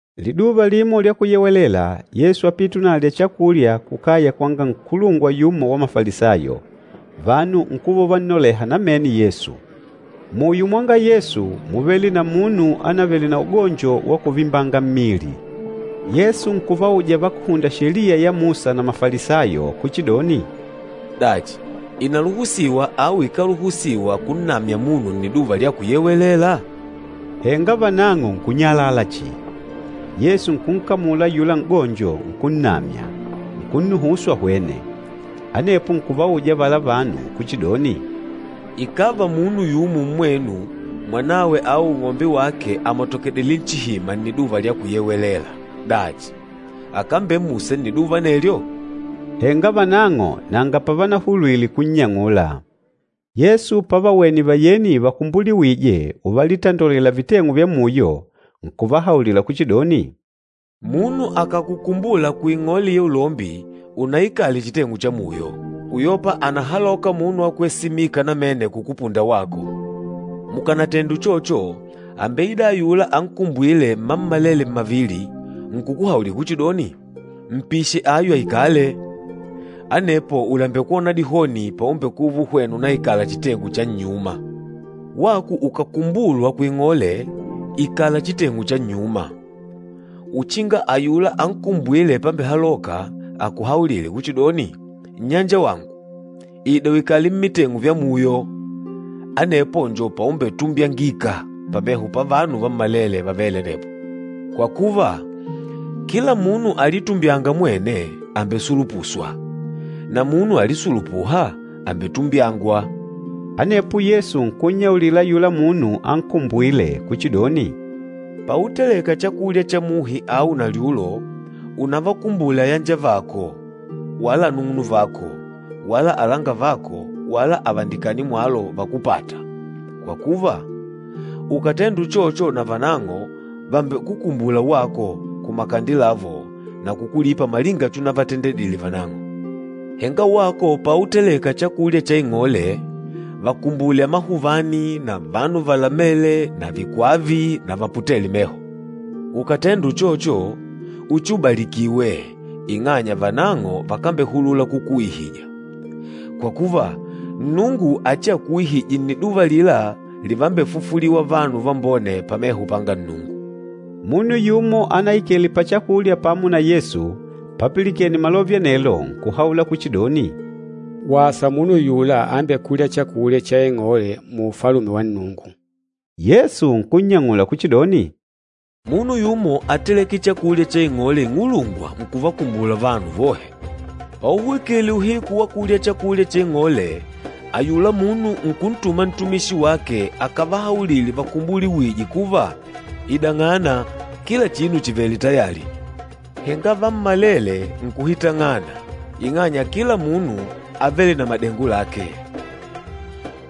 Liduva limo lya Kuyewelela, Yesu ápite unalya chakulya kukaya kwanga nkulungwa yumo wa Mafalisayo, vanu nkuva uvannoleha namene Yesu. Muyo mwanga Yesu, múvele na munu ánavele na ugonjo wa kuvimbanga mmili. Yesu nkuvauja vakúhunda Sheliya ya Musa na Mafalisayo kuchidoni, “Dachi, ìnaluhusiwa au ikáluhusiwa kunnamya munu Nniduva lya Kuyewelela?” Henga vanang'o nkunyalala chihi. Yesu nkunkamula ayula n'gonjo, nkunnamya, nkunnuhusu ahwene. Anepo nkuvauja avala vanu kuchidoni, “Ikàva munu yumo mmwenu, mwanawe au ung'ombe wake àmatokedile nchihima Nniduva lya Kuyewelela, dachi akambemmusa nniduva anelyo?” Henga vanang'o nanga pavanahulwile kunnyang'ula. Yesu pavawene vayeni vakumbuliwîje uvalitandolela viteng'u vya muyo, nkuvahaulila kuchidoni, “Munu akàkukumbula kuing'ole ya ulombi, unaikale chiteng'u cha muyo, uyopa ànahaloka munu wa kwesimika namene kukupunda wako. Mukànatende uchocho, àmbeida ayula ankumbwîle mmammalele mmavili nkukuhaulila kuchidoni, ‘Mpishe ayu aikale.’ Anepo ùlembekwona dihoni paumbekuva uhwena unaikala chiteng'u cha nnyuma. Wako ukàkukumbulwa kuing'ole, ikala chiteng'u cha nnyuma, uchinga ayula ankumbwîle pambehaloka akuhaulile kuchidoni, ‘Nnyanjawangu, ida uikale mmiteng'u vya muyo.’ Anepo njo paumbetumbyangika pameho pavanu vammalele vavêle anepo. Kwa kuva, kila munu alitumbyânga mwene àmbesulupuswa, na munu alisulupûha, àmbetumbyangwa.” Anepo Yesu nkunnyaulila ayula munu ankumbwîle kuchidoni, “Pauteleka chakulya cha muhi au nalyulo, unavakumbule ayanjavako wala anung'unuvako wala alangavako wala avandikani mwalo vakúpata, kwa kuva, ukàtenda uchocho navanang'o vàmbekukumbula wako kumakande lavo na kukulipa malinga chunavatendedile vanang'o. Henga wako pauteleka chakulya cha ing'ole, vakumbule amahuvani na vanu valamele na vikwava na vaputêle meho. Ukàtenda uchocho, uchiubalikiwe, ing'anya vanang'o vakambehulula kukuuihija. Kwa kuva, Nnungu achiakuuihije nniduva alila livambefufuliwa vanu vambone pameho panga Nnungu.” Munu yumo anaikele pachakulya pamo na Yesu papilikene malove anelo nkuhaula kuchidoni, “Wasa munu ayula ambekûlya chakulya cha ing'ole mu Ufalume wa Nnungu.” Yesu nkunnyang'ula kuchidoni, “Munu yumo áteleke chakulya cha ing'ole ing'ulungwa nkuvakumbula vanu vohe. Pauhwikile uhiku wa kulya chakulya cha ing'ole, ayula munu nkuntuma ntumishi wake akavahaulile vakumbuliwîje kuva, ‘Idang'ana, kila chinu chìvele tayali.’ Henga vammalele nkuhitang'ana ing'anya kila munu ávele na madengo lake.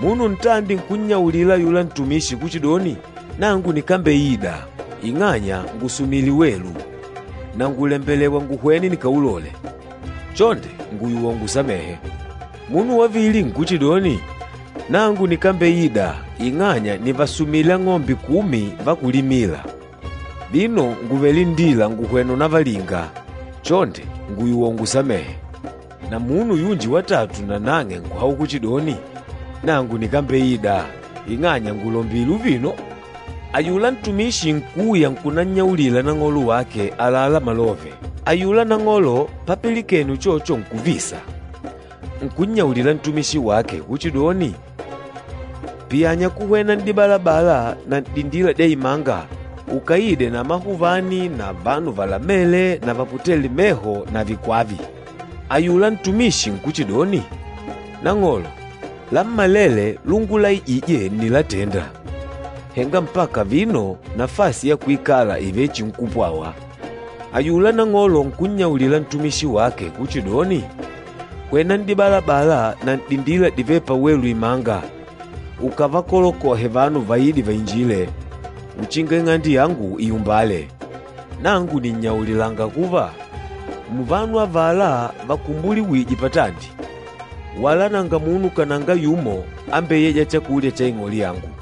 Munu ntandi nkunnyaulila ayula ntumishi kuchidoni, ‘Nangu nikambeida, ing'anya ngùsumile welu, na ngùlembelewa nguhwene nikaulole, chonde ngùyuwa ungusamehe.’ Munu wavili nkuchidoni, ‘Nangu nikambeida ing'anya nìvasumile ang'ombe kumi va kulimila, vino ngùvele nndila ngùhwena unavalinga, chonde ngùyuwa ungusamehe.’ Na munu yunji watatu nang'e nkuhaula kuchidoni, ‘Nangu nikambeida, ing'anya ngùlombile uvino.’ Ayula ntumishi nkuuya nkunannyaulila nang'olo wake àlalá malove. Ayula nang'olo papilikene uchocho nkuvisa, nkunnyaulila ntumishi wake kuchidoni, ‘Piyanya kuhwena n'dibalabala na n'dindila dya imanga ukaide na amahuvani na vanu valamele na vaputêle meho na vikwava.’ Ayula ntumishi nkuchidoni, ‘Nang'olo, lammalele lungulaijije ǹnilatenda, henga mpaka vino nafasi ya kuikala ìvechinkupwawa.’ Ayula nang'olo nkunnyaulila ntumishi wake kuchidoni, ‘Hwena n'dibalabala na n'dindila divêle pawelu imanga ukavakolokohe vanu vaide vainjile, uchinga ing'ande yangu iumbale. Nangu nìnnyaulilanga kuva, muvanu avala vanakumbuliwije patandi, wala nanga munu kananga yumo ambeyêja chakulya cha ing'ole yangu.’”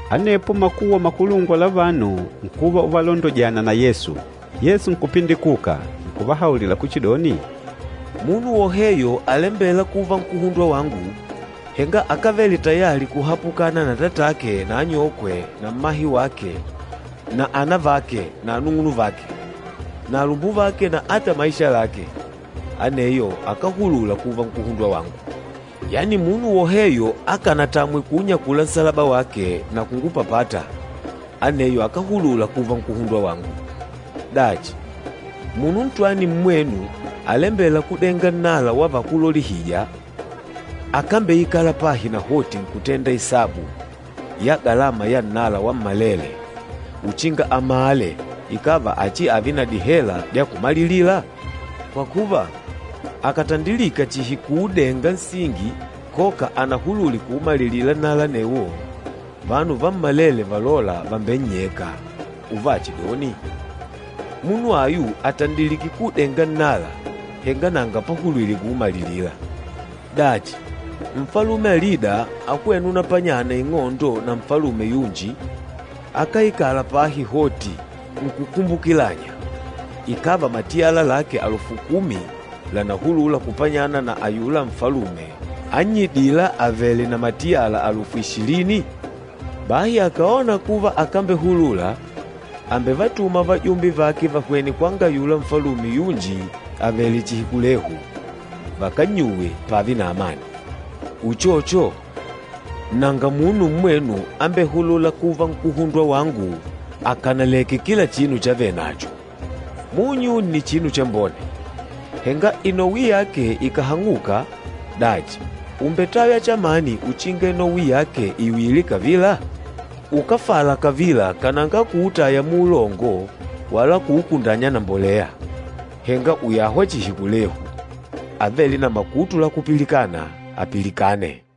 Anepo makuwa makulungwa la vanu nkuva uvalondojana na Yesu. Yesu nkupindikuka, nkuvahaulila kuchidoni, “Munu woheyo alembêla kuva nkuhundwa wangu, henga akávele tayali kuhapukana na atatake na anyokwe na mmahe wake na anavake na anung'unuvake na alumbuvake na ata maisha lake, aneyo akáhulula kuva nkuhundwa wangu. Yani munu woheyo akánatamwe kuunyakula nsalaba wake na kungupapata, aneyo akáhulula kuva nkuhundwa wangu. Dachi, munu ntwani mmwenu alembêla kudenga nnala wa vakúlolihija, akámbeikala pahi nahoti nkutenda isabu ya galama ya nnala wammalele, uchinga amale ikàva achiave na dihela dya kumalilila? Kwa kuva, akàtandilika chihi kuudenga nsingi koka anahulule kuumalilila nnala anewo, vanu vammalele valôla vàmbennyeka, uvachidoni, ‘Munu ayu àtandilike kuudenga nnala, henga nanga pahulwile kuumalilila.’ Dachi, nfalume alida ahwêna unapanyana ing'ondo na nfalume yunji, akáikala pahi hoti nkukumbukilanya, ikàva matiyala lake alufu kumi lànahulula kupanyana na ayula nfalume annyidîla avèlè na matiyala alufu ishilini? Bahi akàona kuva akambehulula, àmbevatuma vajumbe vake vahwene kwanga ayula nfalume yunji avèlè chihi kulehu, vakannyuwe pààve na amani. Uchocho, nanga munu mmwenu ambehulûla kuva nkuhundwa wangu, akànaleke kila chinu chavenacho.” “Munyu nni chinu chambone. Henga inowi yake ikàhang'uka, dachi, ùmbetaywa chamani uchinga inowi yake iuyile kavila? Ukáfala kavila kananga kuutaya muulongo wala kuukundanya na mbolea. Henga ùyahwa chihi kulehu. Avêle na makutu la kupilikana, apilikane!”